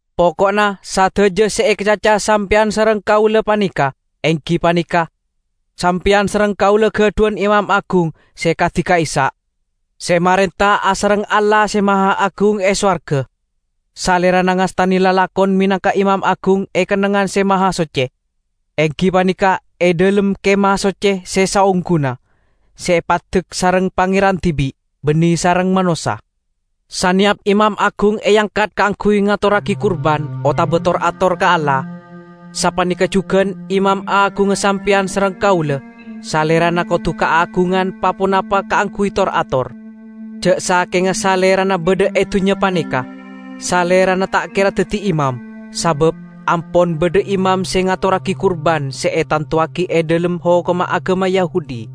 Poko'na sadaja se ekacaca sampeyan sareng kaula paneka enggi paneka: Sampeyan sareng kaula gadhuwan Imam Agung se kadi ka'issa', se marenta asareng Allah Se Mahaagung e sowarga. Salerana ngastane lalakon menangka Imam Agung e Kennengngan Se Mahasocce, enggi paneka e dhalem Kemah Socce se saongguna, se epaddek sareng Pangeran dibi', banne sareng manossa. Saneyap imam agung eangkat kaangguy ngatorragi kurban otaba tor-ator ka Allah. Sapaneka jugan Imam Agungnga sampeyan sareng kaula; Salerana kodu kaagungan pa-ponapa kaangguy tor-ator. Ja' sakenga Salerana badha e dunnya paneka, Salerana ta' kera daddi imam, sabab ampon badha imam se ngatorragi kurban se etantowagi e dhalem hokomma agama Yahudi.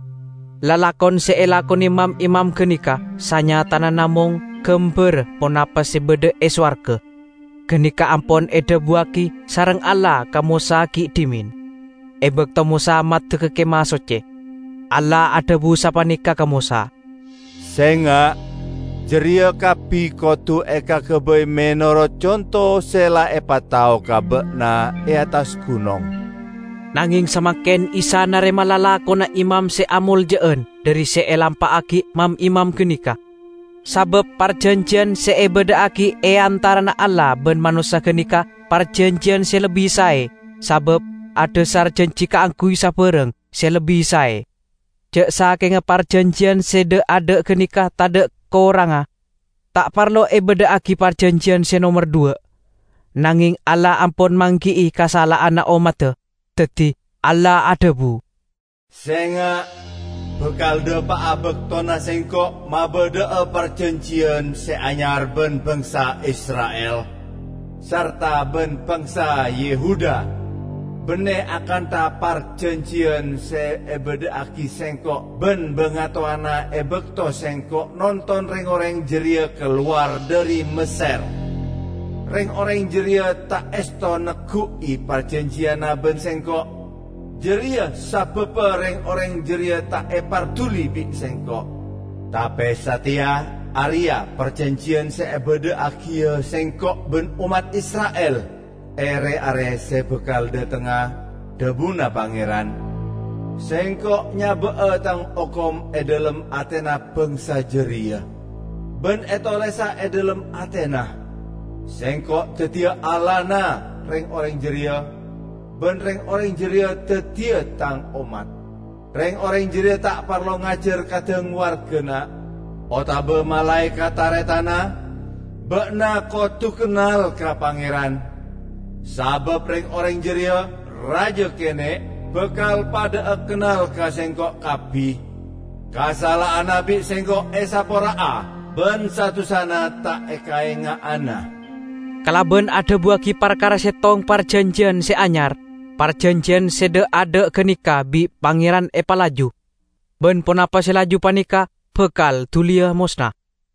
Lalakon se elakone mam-imam ganeka sanyatana namong gambarra ponapa se badha e sowarga. Ganeka ampon edhabuwagi sareng Allah ka Mosa gi' dhimen, e bakto Mosa maddegga Kemah Socce. Allah adhabu sapaneka ka Mosa, "Senga'! Jareya kabbi kodu ekagabay menorot conto se la epatao ka ba'na e attas gunong." Nangeng samangken Isa narema lalakonna imam se amolja'an dhari se elampa'agi mam-imam ganeka. Sabab parjanjiyan se ebadha'agi e antarana Allah ban manossa ganeka parjanjiyan se lebbi sae sabab adhasar janji kaangguy sabarang se lebbi sae. Ja' sakenga parjanjiyan se dha'-adha' ganeka tadha' korangnga, ta' parlo ebadha'agi parjanjiyan se nomer dhuwa'. Nangeng Allah ampon manggi'i kasala'anna ommadda, daddi Allah adhabu, "Senga', bakal dhapa'a baktona Sengko' mabadha'a parjanjiyan se anyar ban bangsa Isra'il, sarta ban bangsa Yehuda. Banne akantha parjanjiyan se ebadha'agi Sengko' ban bangatowana e bakto Sengko' nonton reng-oreng jareya kalowar dhari Messer. Reng-oreng jareya ta' esto neggu'i parjanjiyanna ban Sengko'; jareya sababba reng-oreng jareya ta' eparduli bi' Sengko'. Tape sateya, areya' parjanjiyan se ebadha'agiya Sengko' ban ommat Isra'il e re-are se bakal dhatengnga, dhabuna Pangeran: Sengko' nyaba'a Tang hokom e dhalem atena bangsa jareya, ban etolesa e dhalem atena. Sengko' daddiya Allahna reng-oreng jareya, ban reng-oreng jareya daddiya Tang ommat. Reng-oreng jareya ta' parlo ngajar kadhang wargana, otaba malae ka taretanna, 'Ba'na kodu kennal ka Pangeran.' Sabab reng-oreng jareya, raja kene', bakal padha'a kennal ka Sengko' kabbi. Kasala'anna bi' Sengko' esapora'a ban sa-dusana ta' ekaenga'ana." Kalaban adhabuwagi parkara settong parjanjiyan se anyar, parjanjiyan se dha'-adha' ganeka bi' Pangeran epalaju; ban ponapa se laju paneka bakal duliya mosna.